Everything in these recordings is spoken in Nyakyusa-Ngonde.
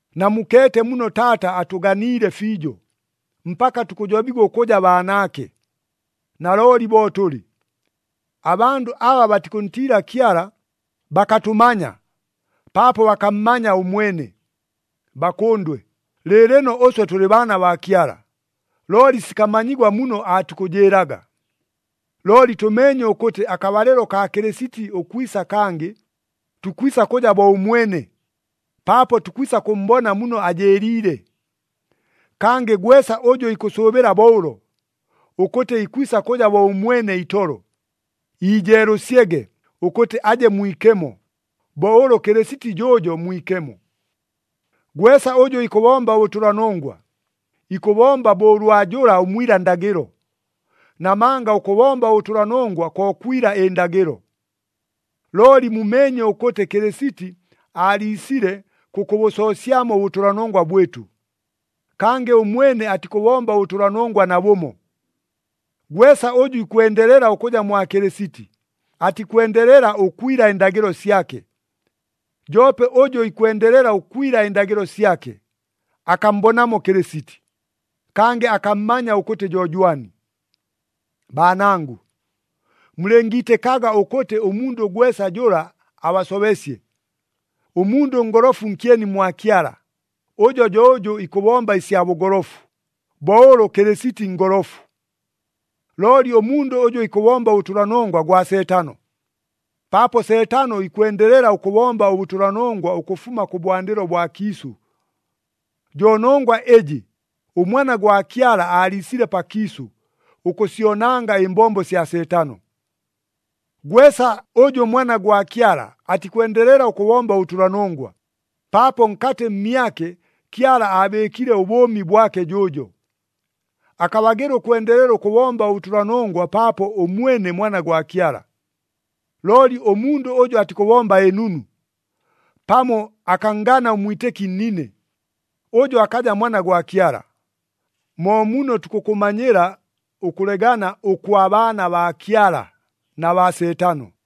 Namukeete muno Taata atʉganiile fiijo, mpaka tukʉjobigwa ʉkʉja baanaake! Nalooli bo tʉlɨ. Abandʉ aba batikʉntiila Kyala bakatʉmanya, paapo bakammanya ʉmwene. Bakʉndwe, lɨɨlɨno ʉswe tʉlɨ baana baa Kyala, looli sikamanyigwa muno aatukʉjɨɨlaga. Looli tʉmeenye ʉkʉtɨ akabalɨlo kaa Kɨlɨsiti ʉkwisa kangɨ, tukwisa kʉja bo ʉmwene, paapo tukwisa kʉmmbona muno ajɨɨliile. Kangɨ gwesa ʉjʉ ikʉsʉʉbɨla bo ʉlo, ʉkʉtɨ ikwisa kʉja bo ʉmwene itolo, iijeelʉsyege ʉkʉtɨ aje mwikemo, bo ʉlʉ Kɨlɨsiti jʉʉjo mwikemo. Gwesa ʉjʉ ikʉbomba ʉbʉtʉlanongwa, ikʉbomba bo ʉlwa jʉla ʉmwila ndagɨlo, namanga ʉkʉbomba ʉbʉtʉlanongwa ko kwila ɨndagɨlo. Looli mumeenye ʉkʉtɨ Kɨlɨsiti aaliisile kʉkʉbʉsoosyamo ʉbʉtʉlanongwa bwɨtʉ. Kangɨ ʉmwene atikʉbomba ʉbʉtʉlanongwa nabʉmo. Gwesa ʉjʉ ikwendelela ʉkʉja mwa Kɨlɨsiti, atikwendelela ʉkwila ɨndagɨlo syake. Joope ʉjʉ ikwendelela ʉkwila ɨndagɨlo syake, akammbonamo Kɨlɨsiti, kangɨ akammanya ʉkʉtɨ jo jwani. Baanangʉ, mulɨngiitɨkaga ʉkʉtɨ ʉmundʉ gwesa jʉla abasobesye. Ʉmundʉ ʉngolofu nkyeni mwa Kyala, ʉjo jo ʉjʉ ikʉbomba ɨsya bʉgolofu, bo ʉlʉ Kɨlɨsiti ngolofu. Looli ʉmundʉ ʉjʉ ikʉbomba ʉbʉtʉlanongwa gwa Seetano, paapo Seetano ikwendelela ʉkʉbomba ʉbʉtʉlanongwa ʉkʉfuma kʉbwandɨlo bwa kiisʉ. Jo nongwa ɨjɨ, ʉMwana gwa Kyala aaliisile pakiisʉ, ʉkʉsyonanga ɨmbombo sya Seetano. Gwesa ʉjʉ mwana gwa Kyala atikwendelela ʉkʉbomba ʉbʉtʉlanongwa, paapo nkatɨ mmyake Kyala aabɨɨkile ʉbʉʉmi bwake jʉʉjo. Akabagɨla ʉkwendelela ʉkʉbomba ʉbʉtʉlanongwa paapo ʉmwene mwana gwa Kyala. Looli ʉmundʉ ʉjʉ atikʉbomba ɨnunu, pamo akanngana ʉmwitɨki nnine, ʉjo akaja mwana gwa Kyala. Mo muno tukʉkʉmanyila ʉkʉlegana ʉkwa baana baa Kyala na baa Seetano.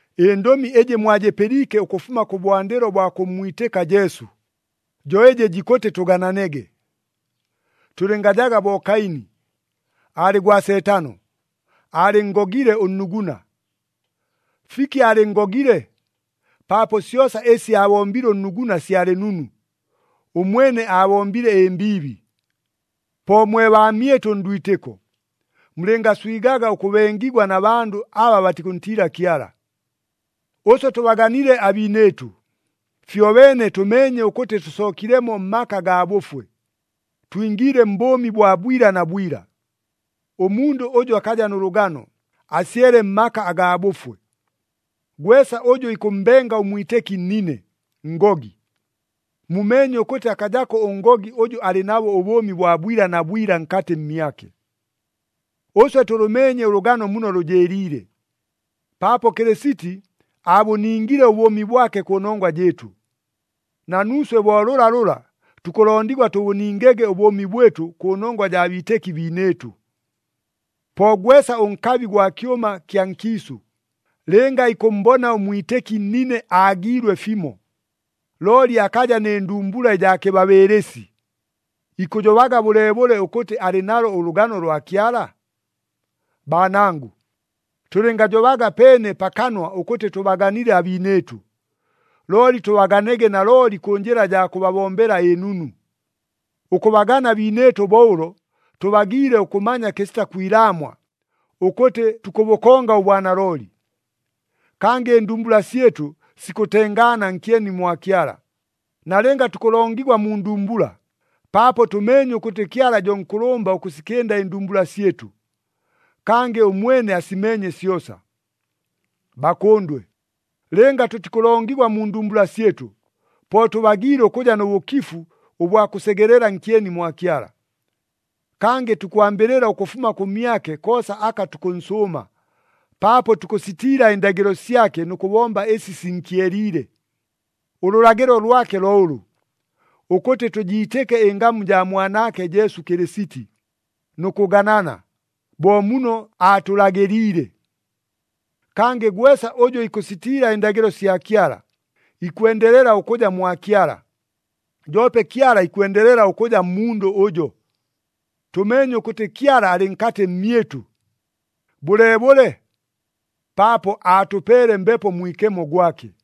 Ɨndʉmi ɨjɨ mwajɨpɨliike ʉkʉfuma kʉbwandɨlo bwa kʉmmwitɨka Jesu, jo ɨjɨ jikʉtɨ tʉgananege. Tʉlɨngajaga bo Kaini. Aalɨ gwa Seetano! Aalɨnngogile ʉnnuguna! Fiki aalɨnngogile? Paapo syosa ɨsi aabombile ʉnnuguna syalɨ nunu. Ʉmwene aabombile ɨmbiibi. Po mwe baamyɨtʉ ndwitɨko, mulɨngaswigaga ʉkʉbengigwa na bandʉ aba batikʉntiila Kyala. Ʉswe tʉbaganile abiinɨɨtʉ, fyobeene tʉmeenye ʉkʉtɨ tʉsookilemo mmaka gaa bʉfwe, twingiile mbʉʉmi bwa bwila na bwila. Ʉmundʉ ʉjʉ akaja nʉ lʉgano, asyele mmaka agaa bʉfwe. Gwesa ʉjʉ ikʉmmbenga ʉmwitɨki nnine, ngogi. Mumeenye ʉkʉtɨ akajako ʉngogi ʉjʉ alɨ nabo ʉbʉʉmi bwa bwila na bwila nkatɨ mmyake. Ʉswe tʉlʉmeenye ʉlʉgano muno lʉjɨɨliile, paapo Kɨlɨsiti aabʉningile ʉbʉʉmi bwake kʉnongwa jɨɨtʉ. Na nuuswe bo lʉlalʉla tukʉlondigwa tʉbʉningege ʉbʉʉmi bwɨtʉ kʉnongwa jaa biitɨki biinɨɨtʉ. Po gwesa ʉnkabi gwa kyʉma kya nkiisʉ, lɨnga ikʉmmbona ʉmwitɨki nnine aagiilwe fimo, looli akaja nɨ ndumbula ɨjaa kɨbabɨɨlɨsi, ikʉjobaga bʉleebʉle ʉkʉtɨ alɨ nalo ʉlʉgano lwa Kyala? Baanangʉ, tʉlɨngajobaga peene pa kanwa ʉkʉtɨ tʉbaganile abiinɨɨtʉ, looli tʉbaganege nalooli kʉ njɨla jaa kʉbabombela ɨnunu. Ʉkʉbagana abiinɨɨtʉ bo ʉlo, tʉbagiile ʉkʉmanya kɨsita kwilaamwa, ʉkʉtɨ tukʉbʉkonga ʉbwanalooli. Kangɨ ɨndumbula syɨtʉ sikʉtengaana nkyeni mwa Kyala, nalɨnga tukʉlongigwa mu ndumbula, paapo tʉmeenye ʉkʉtɨ Kyala jo nkʉlʉmba ʉkʉsikɨnda ɨndumbula syɨtʉ. Kangɨ ʉmwene asimeenye syosa. Bakʉndwe, lɨnga tʉtikʉlongigwa mu ndumbula syɨtʉ, po tʉbagiile ʉkʉja nʉ bʉkifu ʉbwa kʉsegelela nkyeni mwa Kyala. Kangɨ tukwambɨlɨla ʉkʉfuma kʉmyake koosa aka tukʉnsʉʉma, paapo tukʉsitiila ɨndagɨlo syake nʉ kʉbomba ɨsi sinkyeliile. Ʉlʉlagɨlo lwake lo ʉlʉ, ʉkʉtɨ tʉjiitɨke ɨngamu jaa Mwanaake Jesu Kɨlɨsiti, nʉ kʉganana, bo muno aatʉlagɨliile. Kangɨ gwesa ʉjʉ ikʉsitiila ɨndagɨlo sya Kyala, ikwendelela ʉkʉja mwa Kyala, joope Kyala ikwendelela ʉkʉja mmundʉ ʉjo. Tʉmeenye ʉkʉtɨ Kyala alɨ nkatɨ mmyɨtʉ. Bʉleebʉle? Paapo aatʉpeele Mbepo Mwikemo gwake.